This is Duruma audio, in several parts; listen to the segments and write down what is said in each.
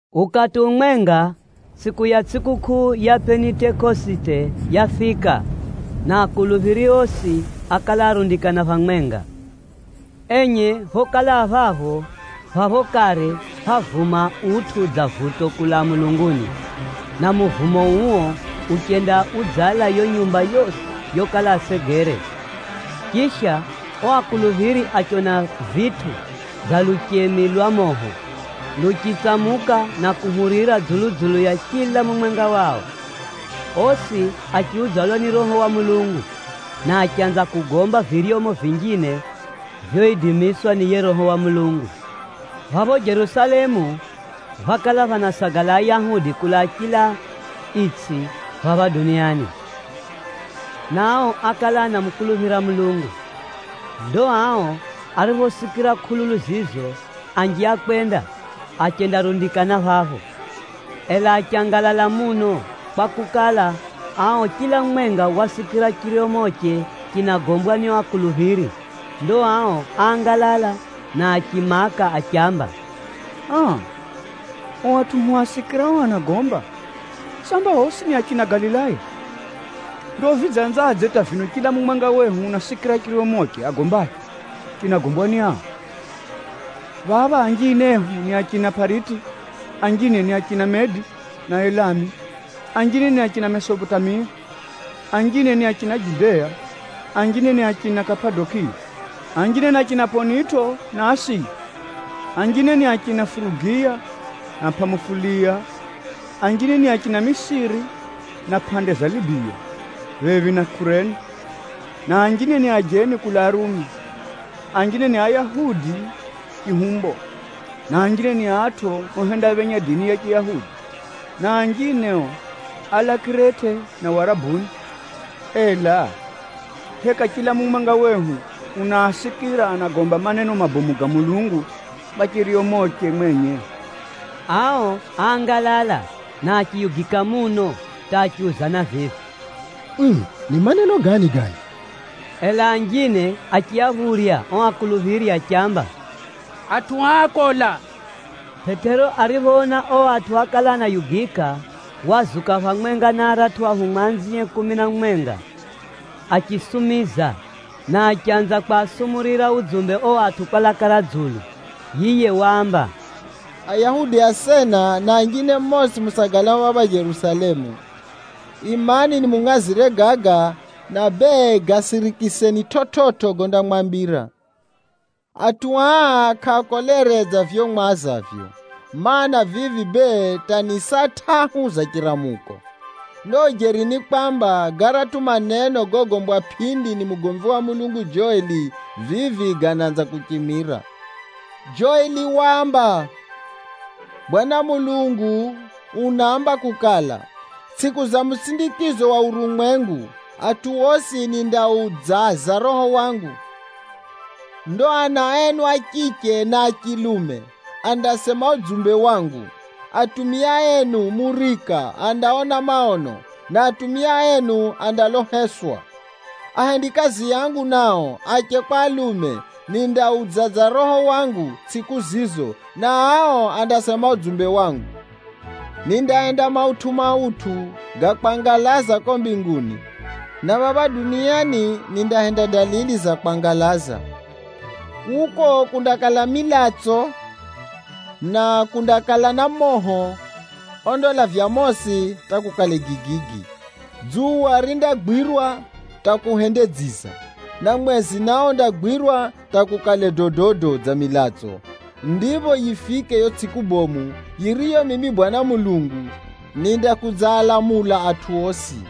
Ukati umwenga, tsʼiku ya tsʼikukʼuu ya Pʼenitekosite yafika, na akuluphiri osi ákala arundikana phamwenga. Enye phokala a phapho, phapho kare phávuma utʼu dza vuto kulaa mulunguni, na muvumo uo uchenda udzala yo nyumba yosi yokala asegere. Chisha, o akuluphiri achiona vitʼu dza luchemi lwa moho, luchitsamuka na kuhurira dzulu-dzulu ya chila mumwenga wao. Osi achiudzalwa ni Roho wa Mulungu, na achanza kugomba viryomo vinjine vyoidimiswa ni yiye Roho wa Mulungu. Phapho Jerusalemu, phákala phanasagala Ayahudi kulaa chila itsʼi phapha duniani, na ao ákala anamukuluphira Mulungu. Ndo ao ariphosikira kʼululu zizo, anji ákwenda, achendarundikana phapho. Ela achangalala muno, kwakukala, ao chila mumwenga wasikira chiryomoche chinagombwa ni o akuluphiri. Ndo ao áangalala na achimaka achiamba, “Aa! O atʼu hwasikirao anagomba, samba osi ni achina Galilaya? Ndo vidzanzadze hata vino chila mumwenga wehu unasikira chiryomoche agombacho chinagombwa ni ao? Phapha anjine ehu ni achina Pʼariti, anjine ni achina Medi na Elamu, anjine ni achina Mesopotamia, anjine ni achina Judea, anjine ni achina Kapadokiya, anjine ni achina Pʼonito na Asiya, anjine ni achina Furugiya na Pʼamufuliya, anjine ni achina Misiri na pʼande za Libiya phephi na Kurene, na anjine ni ajeni kulaa Rumi. Anjine ni Ayahudi chihumbo, na anjine ni atʼu ohendaphenya dini ya Chiyahudi. Na anjine o, álaa Kirete na Warabuni. Ela, heka chila mumwenga wehu unaasikira anagomba maneno mabomu ga Mulungu kwa chiryomoche mwenye!?” Ao áangalala na achiyugika muno hata achiuzana vivi, “Uu! Ni maneno gani gano?” Ela anjine achiaphurya o akuluphiri achiamba, “Atʼu aa akola!” Pʼetero ariphoona o atʼu ákala anayugika, wazuka phamwenga na aratʼu ahumwa anzie kumi na mumwenga, achisumiza na achanza kwasumurira udzumbe o atʼu kwa laka ra dzulu. Yiye waamba, “Ayahudi asena na anjine mosi musagalao phapha Jerusalemu, imani nimungʼazire gaga, na bee, gasirikiseni chividzo gondamwambira. Atʼu aa kʼaakolere dza vivyo mwazavyo, mana, vivi bee hata ni saa tʼahu za chiramuko. Ndo ujeri ni kwamba, garatʼu maneno gogombwa pʼindi ni mugomvi wa Mulungu Joeli, vivi ganaanza kuchimira. Joeli waamba, ‘Bwana Mulungu unaamba kukala, “Tsʼiku za musindikizo wa urumwengu, nindamwaga Roho wangu dzulu ya atʼu osi. Ndo ana enu a chiche na a chilume, andasema udzumbe wangu. Atana enu andaona maono, na atumia enu andaloha ndoso. Ahendikazi angu nao, ache kwa alume, nindaaudzaza Roho wangu tsʼiku zizo, na ao andasema udzumbe wangu. Nindahenda maneno ga kwangalaza ko mbinguni, na phapha duniani, nindahenda dalili za kwangalaza. Kuko kundakala na milatso, na moho, na maingu ga mosi. Dzuwa rindagwirwa hata kuhende dziza, na mwezi nao undagwirwa hata kukale dododo dza milatso, kabila ya yo tsʼiku bomu ya Bwana Mulungu kufika.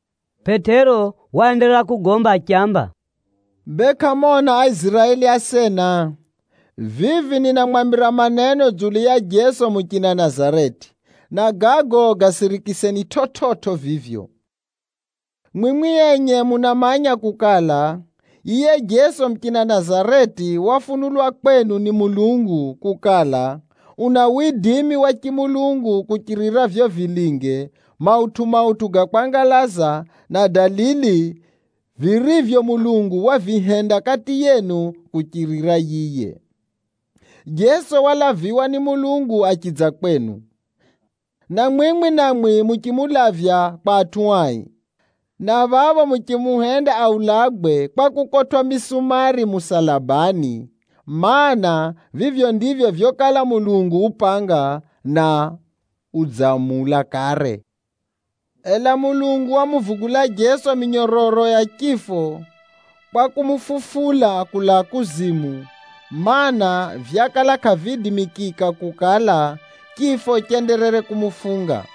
Pʼetero waenderera kugomba achiamba, “Bee kʼamona Aiziraeli asena, vivi ninamwambira maneno dzulu ya Jeso muchina Nazareti, na gago gasirikiseni chividzo vivyo. Mwimwi enye munamanya kukala, yiye Jeso muchina Nazareti wafunulwa kwenu ni Mulungu kukala, una widimi wa chimulungu kuchirira vivyo vilinge, mautʼu-mautʼu ga kwangalaza na dalili, virivyo Mulungu wavihenda kati yenu kuchirira yiye. Jeso walaviwa ni Mulungu achidza kwenu, na mwimwi namwi muchimulavya kwa atʼu ai, na phapho muchimuhenda aulagwe kwa kukotwʼa misumari musalabani, mana, vivyo ndivyo vyokala Mulungu upanga, na udzamula kare. Ela Mulungu wamuvugula Jeso minyororo ya chifo kwa kumufufula kulaa kuzimu, mana, vyakala kʼaviidimikika kukala, chifo chenderere kumufunga.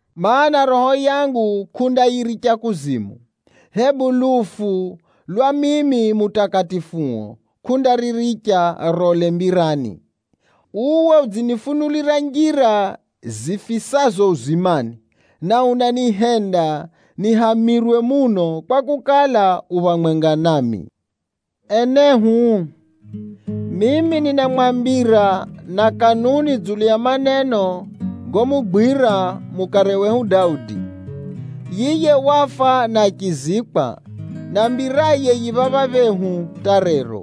Maana, roho yangu kʼundayiricha kuzimu, hebu lufu lwa mimi Mutakatifuo role. Uwe udzinifunulira njira za uzimani, na unanihenda nihamirwe muno, kwakukala, u phamwenga nami.’ “Enehu, mimi ninamwambira na kanuni dzulu ya maneno gomugwira mukare wehu Daudi. Yiye wafa na achizikwa, na mbiraye yi phapha phehu hata rero.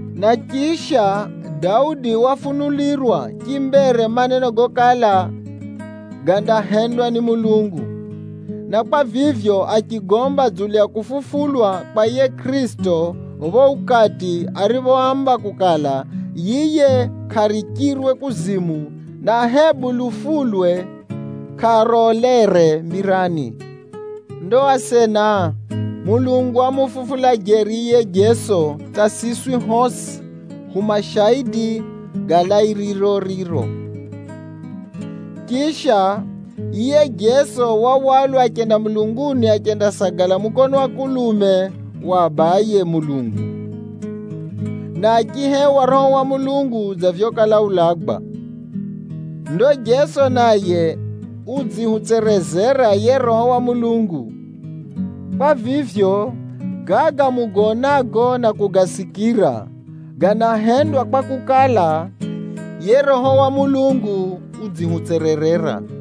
Na chisha, Daudi wafunulirwa chimbere maneno gokala gandahendwa ni Mulungu. Na kwa vivyo, achigomba dzulu ya kufufulwa kwa yiye Kʼirisito pho ukati ariphoamba kukala, yiye kʼarichirwe kuzimu, na hebu lufulwe kʼarolere mbirani. Ndo asena, Mulungu wamufufula jeri yiye Jeso hata siswi hosi, hu mashaidi ga lairiro riro. Chisha, yiye Jeso wahwalwa achenda mulunguni achendasagala mukono wa kulume wa Abaye Mulungu, na achihewa Roho wa Mulungu dza vyokala ulagwa. Ndo Jeso naye udzihutserezera yiye Roho wa Mulungu. Kwa vivyo, gaga mugaonago na kugasikira, ganahendwa kwakukala, yiye Roho wa Mulungu udzihutsererera.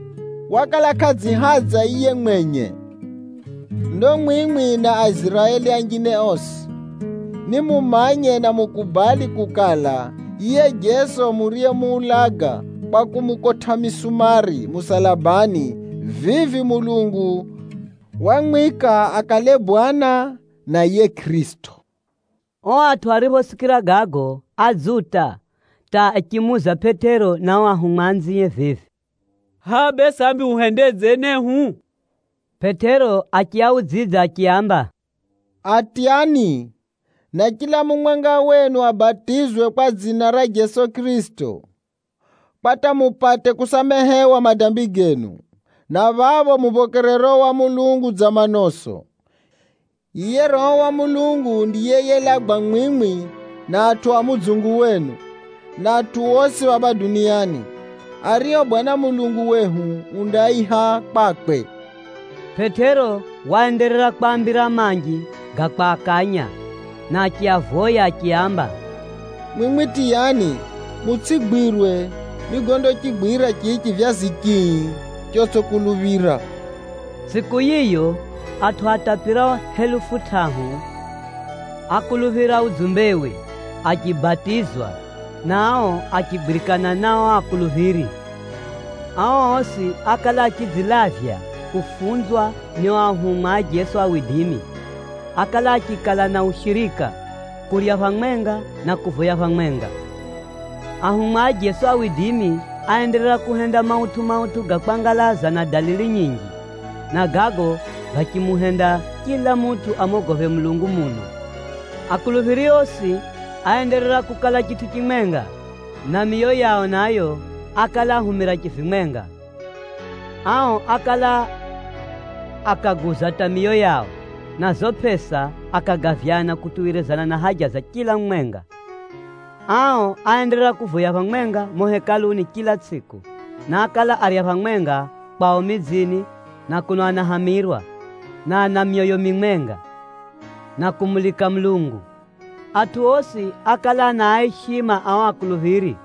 “wakala kʼadzihadza yiye mwenye. “Ndo mwimwi na Aiziraeli anjine osi, nimumanye na mukubali kukala, yiye Jeso muriyemuulaga kwa kumukotʼa misumari musalabani, vivi Mulungu wamwika akale Bwana, na yiye Kʼirisito!” O atʼu ariphosikira gago, adzuta hata achimuuza Pʼetero na o ahumwa anzie vivi, “Hʼa bee sambi huhendedze enehu?” Pʼetero achiaudzidza achiaamba, “Atyani, na chila mumwenga wenu abatizwe kwa dzina ra Jeso Kʼirisito, kwa hata mupate kusamehewa madambi genu, na phapho muphokere Roho wa Mulungu dza manoso. Yiye Roho wa Mulungu ndiye yelagwa mwimwi na atʼu a mudzungu wenu, na atʼu osi phapha duniani, ario Bwana Mulungu wehu undaaiha kwakwe.” Pʼetero waenderera kwaambira manji ga kwakanya, na achiavoya achiaamba, “Mwimwi tiyani, mutsʼigwirwe ni gondachigwira chichi chivyazi chii chotsʼikuluphira!” Tsʼiku yiyo, atʼu atapirao helufu tʼahu ákuluphira udzumbewe, achibatizwa na ao achigwirikana na o akuluphiri. Ao osi ákala achidzilavya kufunzwa ni o ahumwa a Jeso, ákala achikala na ushirika, kurya phamwenga, na kuvoya phamwenga. Ahumwa a Jeso áenderera kuhenda mautʼu-mautʼu ga kwangalaza na dalili nyinji, na gago gachimuhenda chila mutʼu amogophe Mulungu muno. Akuluphiri osi áenderera kukala chitʼu chimwenga, na miyo yao nayo, ákala ahumira chivimwenga. Ao ákala akaguza hata miyo yao, na zo pʼesa akagavyana kutuwirizana na haja za chila mumwenga. Ao áenderera kuvoya phamwenga mumo Hekaluni chila tsʼiku, na ákala arya phamwenga kwao midzini na kuno anahamirwa, na ana myoyo mimwenga, na kumulika Mulungu. Atʼu osi ákala anaaishima ao akuluphiri,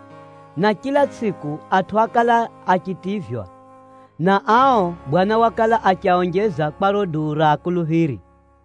na chila tsʼiku, atʼu ákala achitivywa, na ao Bwana wakala achiaonjeza kwa riro duu ra akuluphiri.